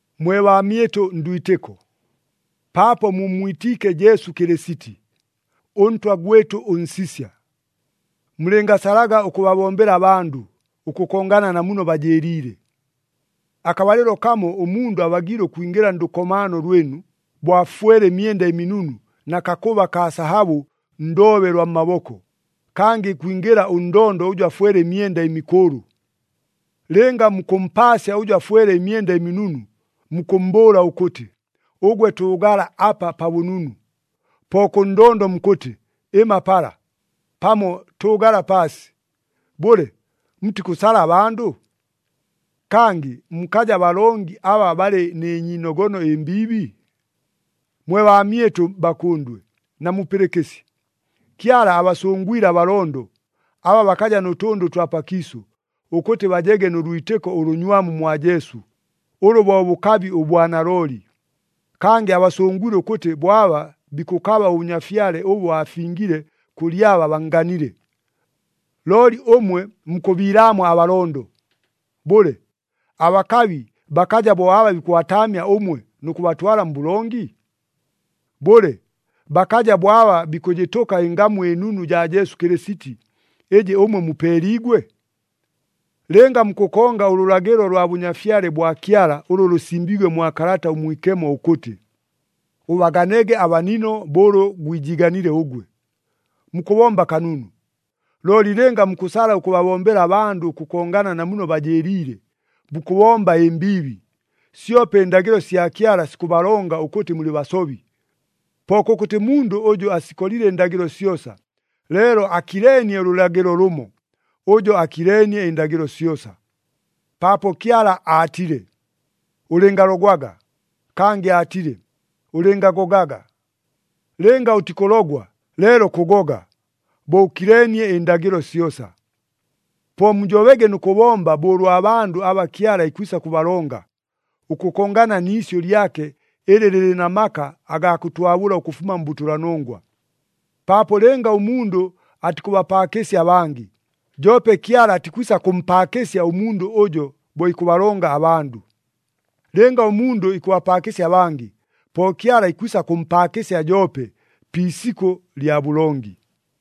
Mwe baamyɨtʉ ndwitɨko, paapo mummwitiike Jesu Kɨlɨsiti, ʉNtwa gwɨtʉ ʉNsisya, mulɨngasalaga ʉkʉbabombela abandʉ, ʉkʉkongana na muno bajɨɨliile. Akabalɨlo kamo ʉmundʉ abagiile ʉkwingɨla ndʉkomaano lwɨnu, bo afwele ɨmyenda ɨminunu na kakʉba kaa sahabʉ ndoobe lwa mmaboko, kangɨ ikwingɨla ʉndondo ʉjʉ afwele ɨmyenda ɨmikʉʉlʉ. Lɨnga mukʉmpaasya ʉjʉ afwele ɨmyenda ɨminunu, mukʉmmbʉʉla ʉkʉtɨ, “Ʉgwe tʉʉgala apa pa bʉnunu,” po kʉ ndondo mukʉtɨ, “Ɨma pala,” pamo, “Tʉʉgala paasi,” bʉle, mutikʉsala abandʉ? Kangɨ mukaja balongi aba balɨ nɨ nyiinogono ɨmbiibi? Mwe baamyɨtʉ bakʉndwe, namupɨlɨkɨsye! Kyala abasʉngwile abalondo, aba bakaja nʉ tʉndʉ ʉtwa pakiisʉ, ʉkʉtɨ bajege nʉ lwitɨko ʉlʉnywamu mwa Jesu, ʉlʉ bo bʉkabi ʉbwa nalooli. Kangɨ abasʉngwile ʉkʉtɨ bo aba bikʉkaba ʉbʉnyafyale ʉbʉ aafingile kʉlɨ aba bannganile. Looli ʉmwe mukʉbiilaamwa abalondo! Bʉle, abakabi bakaja bo aba bikʉbataamya ʉmwe nʉ kʉbatwala mbʉlongi? Bʉle, bakaja bo aba bikʉjɨtʉka ɨngamu ɨnunu jaa Jesu Kɨlɨsiti, ɨjɨ ʉmwe mupeeliigwe? Lɨnga mukʉkonga ʉlʉlagɨlo lwa Bʉnyafyale bwa Kyala ʉlʉ lʉsimbiigwe mwa Kalata ʉMwikemo ʉkʉtɨ, “Ʉbaganege abanino bo ʉlʉ gwijiiganile ʉgwe,” mukʉbomba kanunu. Looli lɨnga mukʉsala ʉkʉbabombela abandʉ ʉkʉkongana na muno bajɨɨliile, mukʉbomba ɨmbiibi, syope ɨndagɨlo sya Kyala sikʉbalonga ʉkʉtɨ mulɨ basobi. Po kʉkʉtɨ mundʉ ʉjʉ asikolile ɨndagɨlo syosa, leelo akileenie ʉlʉlagɨlo lʉmo, ʉjo akileenie ɨndagɨlo syosa, paapo Kyala aatile, “Ʉlɨngalogwaga,” kangɨ aatile, “Ʉlɨngagogaga.” Lɨnga ʉtikʉlogwa, leelo kʉgoga, bo ʉkileenie ɨndagɨlo syosa. Po mujobege nʉ kʉbomba bo ʉlwa bandʉ aba Kyala ikwisa kʉbalonga, ʉkʉkongana ni isyʉ lyake ɨlɨ lɨlɨ na maka agaa kʉtwabʉla ʉkʉfuma mbʉtʉlanongwa. Paapo lɨnga ʉmundʉ atikʉbapaakɨsya abangɨ, joope Kyala atikwisa kʉmpaakɨsya ʉmundʉ ʉjo bo ikʉbalonga abandʉ. Lɨnga ʉmundʉ ikʉbapaakɨsya abangɨ, po Kyala ikwisa kʉmpaakɨsya joope pi isikʉ lya bʉlongi.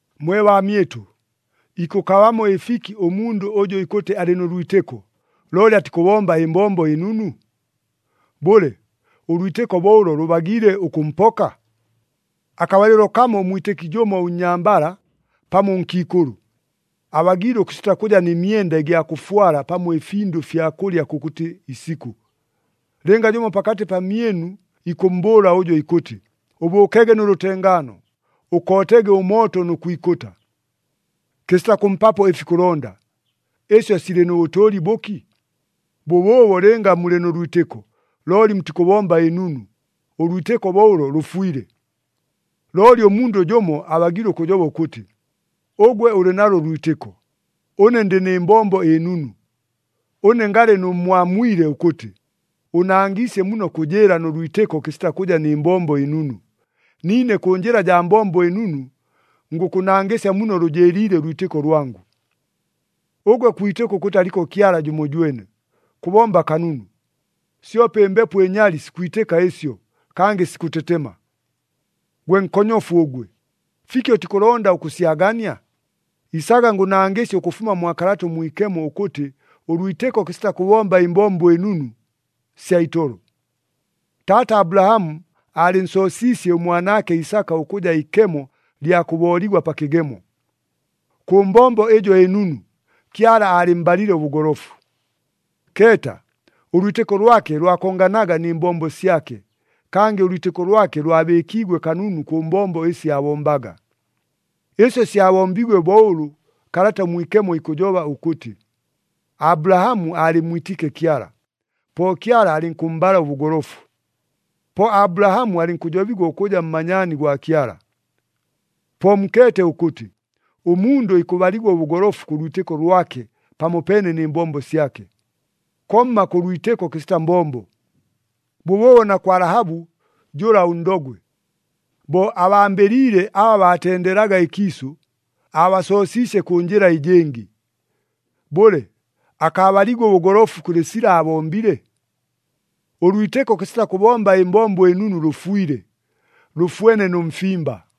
Mwe baamyɨtʉ, ikʉkabamo ɨfiki ʉmundʉ ʉjʉ ikʉtɨ alɨ nʉ lwitɨko, looli atikʉbomba ɨmbombo ɨnunu? Bʉle, ʉlwitɨko bo ʉlo lʉbagiile ʉkʉmpoka? Akabalɨlo kamo ʉmwitɨki jʉmo ʉnnyambala pamo ʉnkiikʉlʉ, abagiile ʉkʉsita kʉja nɨ myenda ɨgya kʉfwala pamo ɨfindʉ fya kʉlya kʉkʉtɨ isikʉ. Lɨnga jʉmo pakatɨ pamyɨnu ikʉmmbʉʉla ʉjo ikʉtɨ, “Ʉbʉʉkege nʉ lʉtengaano, ʉkootege ʉmooto nʉ kwikʉta,” kɨsita kʉmpapo ɨfi ikʉlonda, ɨsyo silɨ nʉ bʉtʉʉli bʉki? Bʉbʉʉbo lɨnga mulɨ nʉ lwitɨko, looli mutikʉbomba ɨnunu, ʉlwitɨko bo ʉlo lʉfwile. Looli ʉmundʉ jʉmo abagiile ʉkʉjoba ʉkʉtɨ, “Ʉgwe ʉlɨ nalo ʉlwitɨko, ʉne ndɨ nɨ mbombo ɨnunu.” Ʉne ngalɨ nʉmmwamwile ʉkʉtɨ, “Ʉʉnangɨsye muno kʉjɨɨla nʉ lwitɨko kɨsita kʉja nɨ mbombo ɨnunu, niine kʉ njɨla jaa mbombo ɨnunu ngʉkʉnangɨsya muno lʉjɨɨliile ʉlwitɨko lwangʉ.” Ʉgwe kwitɨka ʉkʉtɨ aliko Kyala jʉmojwene. Kʉbomba kanunu! Syope ɨmbepo ɨnyali sikwitɨka ɨsyo, kangɨ sikʉtetema. Gwe nkonyofu ʉgwe! Fiki ʉtikʉlonda ʉkʉsyagania? Isaga ngʉnangɨsye ʉkʉfuma mwa Kalata ʉMwikemo ʉkʉtɨ ʉlwitɨko kɨsita kʉbomba ɨmbombo ɨnunu, sya itolo! Taata Abulahamu aalɨnsoosiisye ʉmwanaake Isaka ʉkʉja ikemo lya kʉbooligwa pa kɨgemo. Kʉ mbombo ɨjo ɨnunu, Kyala aalɨmmbalile ʉbʉgolofu. Keeta, ʉlwitɨko lwake lwakonganaga nɨ mbombo syake, kangɨ ʉlwitɨko lwake lwabɨɨkiigwe kanunu kʉ mbombo ɨsi aabombaga. Ɨsyo syabombiigwe bo ʉlʉ Kalata ʉMwikemo ikʉjoba ʉkʉtɨ, “Abulahamu aalɨmmwitiike Kyala, po Kyala alɨnkʉmmbala ʉbʉgolofu.” Po Abulahamu alɨnkʉjobigwa ʉkʉja mmanyaani gwa Kyala. Po mukeete ʉkʉtɨ, ʉmundʉ ikʉbaligwa ʉbʉgolofu kʉ lwitɨko lwake pamopeene nɨ mbombo syake, komma kʉ lwitɨko kɨsita mbombo. Bʉbʉʉbo na kwa Lahabu jʉla ʉndogwe. Bo abambɨliile aba baatendeelaga ɨkiisʉ, aabasoosiisye kʉ njɨla ɨjɨngɨ. Bʉle, akaabaliigwe ʉbʉgolofu kʉlɨ sila aabombile? Ʉlwitɨko kɨsita kʉbomba ɨmbombo ɨnunu lʉfwile, lʉfwene nʉ mfimba.